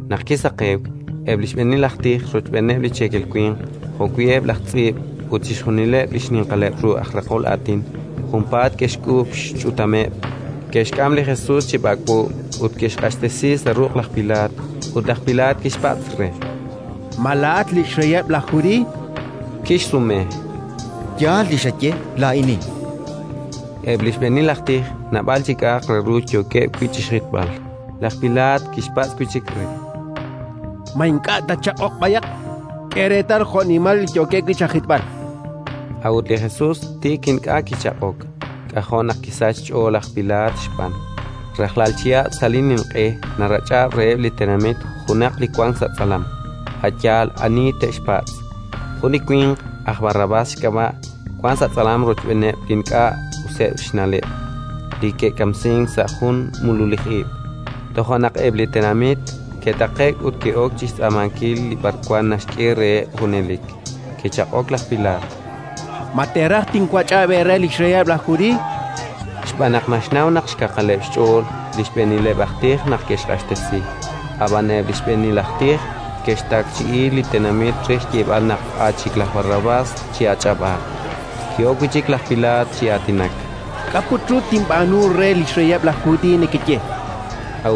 Naq kisaqewk, eb' li xb'eenil aj tij rochb'eeneb' li cheekel winq, jo'wi' eb' laj tz'iib' ut chixjunileb' li xninqaleb' ru aj raqol aatin, junpaat ke'xk'uub' xch'utameb'; ke'xk'am li Jesus chi b'ak'b'o ut ke'xq'axtesi sa' ruq' laj Pilaat. Ut laj Pilaat kixpatz' re: —Ma laa'at li xreyeb' laj Judiiy? Kixsume: —Yaal li xaye: laa'inin. Eb' li xb'eenil aj tij naab'al li k'a'aq re ru yookeb' wi' chi xjitb'al. Laj Pilaat kixpatz' wi' chik re: —Ma ink'a' tatchaq'oq b'ayaq? K'e reetal jo'nimal li yookeb' wi' chajitb'al! A'ut li Jesus tik ink'a' kichaq'ok: k'ajo' naq kisachk xch'ool laj Pilaat xb'aan. Rajlal chihab' sa' li Ninq'e narach'ab' reheb' li tenamit junaq li wank sa' tz'alam, a' yaal ani te'xpatz'. Jun li winq, aj Barrabás xk'ab'a', wank sa' tz'alam rochb'eeneb' li ink'a' useb' xna'leb' li ke'kamsink sa' jun mululij ib'. Toja' naq eb' li tenamit ke'taqe'k ut ke'ok chi xtz'aamankil li b'arwan naxk'e reheb' junelik. Kichaq'ok laj Pilaat: —Ma teeraj tinwach'ab' eere li xreyeb' laj Judiiy? chan reheb'. Xb'aan naq naxnaw naq xkaqaleb' xch'ool li xb'eenileb' aj tij naq ke'xq'axtesi. Ab'an eb' li xb'eenil aj tij ke'xtakchi'i li tenamit re xyeeb'al naq a' chik laj Barrabás chi'ach'ab'aaq. Ki'ok wi' chik laj Pilaat chi aatinak: —K'a' put ru tinb'aanu re li xreyeb' laj Judiiy nekeye? chan reheb'.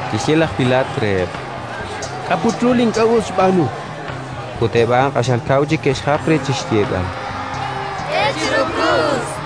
Kixye laj Pilaat reheb': —K'a' put ru li ink'a' us xb'aanu? Ut eb' a'an q'axal kaw chik ke'xjap re chi xyeeb'al: —K'e chiru krus!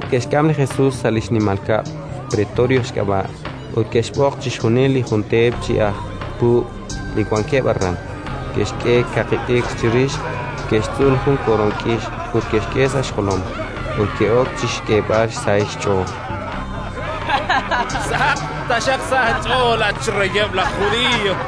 Eb' laj puub' ke'xk'am li Jesus sa' li xnimal kab'l, pretorio xk'ab'a', ut ke'xb'oq chixjunil li jun teep chi aj puub' li wankeb' aran. Ke'xk'e kaqi t'ikr chirix, ke'xtz'ul jun koroon k'ix ut ke'xk'e sa' xjolom. Ut ke'ok chi xk'eeb'al xsahil xch'ool: —Sahaq taxaq sa' aach'ool, at xreyeb' laj Judiiy!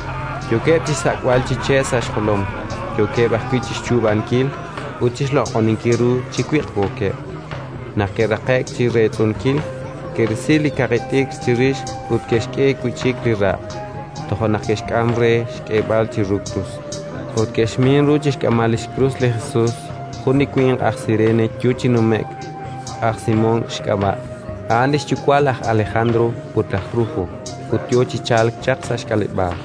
Yookeb' chi xsak'b'al chi che' sa' xjolom, yookeb' ajwi' chi xchuub'ankil ut chi xloq'oninkil ru chi wiq'wookeb'. Naq ke'raqe'k chi reetz'unkil, ke'risi li kaqi t'ikr chirix ut ke'xk'e wi' chik li raq'. Toja' naq ke'xk'am re xk'eeb'al chiru krus. Ut ke'xmin ru chi xk'amb'al li xkrus li Jesus jun li winq aj Sirene yo chi nume'k, aj Simón xk'ab'a'. A'an li xyuwa' laj Alejandro ut laj Rufo, ut yo chi chalk chaq sa' xk'aleb'aal.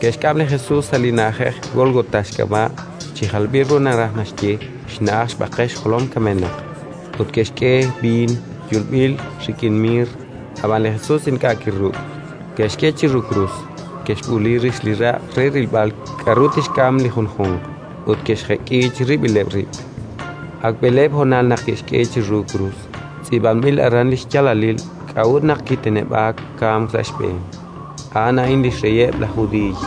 Ke'xk'am li Jesus sa' li na'ajej Gólgota xk'ab'a', chi jalb'il ru naraj naxye: “Xna'aj xb'aqel xjolom kamenaq”. Ut ke'xk'e xb'iin yuub'il rik'in miir, ab'an li Jesus ink'a' kiruk'. Ke'xk'e chiru krus, ke'xb'uuli rix li raq' re rilb'al k'aru tixk'am li junjunq, ut ke'xjek'i chirib'ileb' rib'. Ak b'eleeb' honal naq ke'xk'e chiru krus. Tz'iib'anb'il aran li xyaalalil k'a'ut naq kiteneb'aak kamk sa' xb'een: “A'an a'in li xReyeb' laj Judiiy”.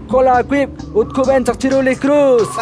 kol aawib' ut kub'en chaq chiru li krus!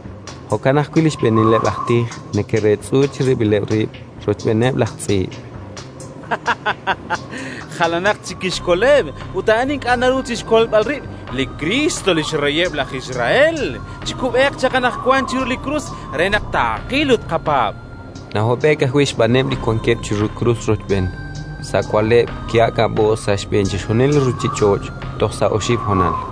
Jo'kan ajwi' li xb'eenileb' aj tij neke'reetz'u chirib'ileb' rib' rochb'eeneb' laj tz'iib': —Jalanatq chik kixkoleb', ut a'an ink'a' naruhank chi xkolb'al rib'! Li Kriist, li xreyeb' laj Israel, chikub'eeq chaq anaqwan chiru li krus re naq taaqil ut taaqapaab'! Nahob'e'k ajwi' xb'aaneb' li wankeb' chiru krus rochb'een. Sa' wa'leb', ki'aak'ab'o'k sa' xb'een chixjunil li ruuchich'och' toj sa' oxib' honal.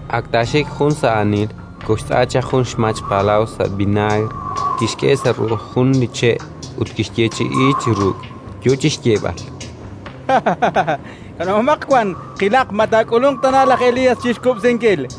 Ak taaxik jun sa' aanil, koxtz'a chaq jun xmach palaw sa' vinaagr, kixk'e sa' ru'uj jun li che' ut kixyeechi'i chi ruk', yo chi xyeeb'al: —Kanab'omaq wan, qilaq ma taak'ulunq tana laj Elías chi xkub'sinkil.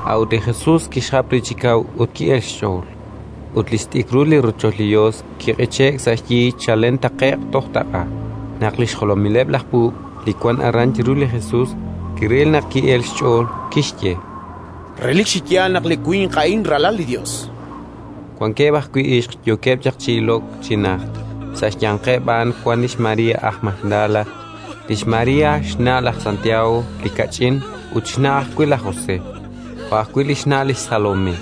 A'ut li Jesus kixjap re chi kaw ut ki'elk xch'ool. Ut li xt'ikrul li rochoch li Yos kiq'iche'k sa' xyi chalen taqe'q toj taq'a. Naq li xjolomileb' laj puub' li wank aran chiru li Jesus kiril naq ki'elk xch'ool, kixye: —Relik chi yaal naq li winq a'in Ralal li Yos! Wankeb' ajwi' ixq yookeb' chaq chi ilok chi najt. Sa' xyanqeb' a'an wank lix María aj Magdala, lix María xna' laj Santiago li kach'in ut xna' ajwi' laj José, jo' ajwi' lix Salomé,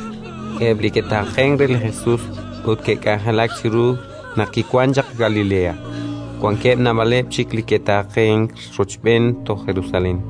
eb' li ke'taaqenk re li Jesus ut ke'k'anjelak chiru naq kiwank chaq Galilea; wankeb' naab'aleb' chik li ke'taqe'k rochb'een toj Jerusalén.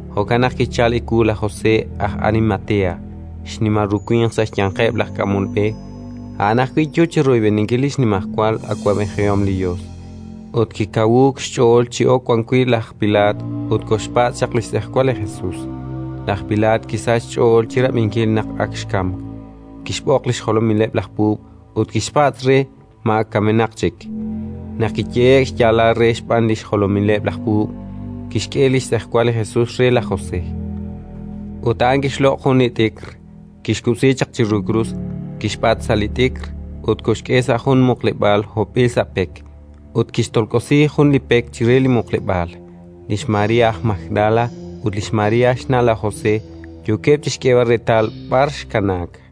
Jo'kan naq kichalk ewu laj José aj Arimatea, xnimal ru winq sa' xyanqeb' laj k'amol b'e. A'an ajwi' yo chi royb'eninkil li xnimajwal awab'ejihom li Yos. Ut kikawuuk xch'ool chi ok wan wi' laj Pilaat ut koxpatz' chaq li xtz'ejwal li Jesus. Laj Pilaat kisachk xch'ool chi rab'inkil naq ak xkamk; kixb'oq li xjolomileb' laj puub' ut kixpatz' re ma ak kamenaq chik. Naq kiyehe'k xyaalal re xb'aan li xjolomileb' laj puub', kixk'e li xtz'ejwal li Jesus re laj José. Ut a'an kixloq' jun li t'ikr, kixkub'si chaq chiru krus, kixb'at sa' li t'ikr ut koxk'e sa' jun muqleb'aal hopb'il sa' pek; ut kixtolk'osi jun li pek chire li muqleb'aal. Lix María aj Magdala ut lix María xna' laj José yookeb' chi xk'eeb'al reetal b'ar xkanaak.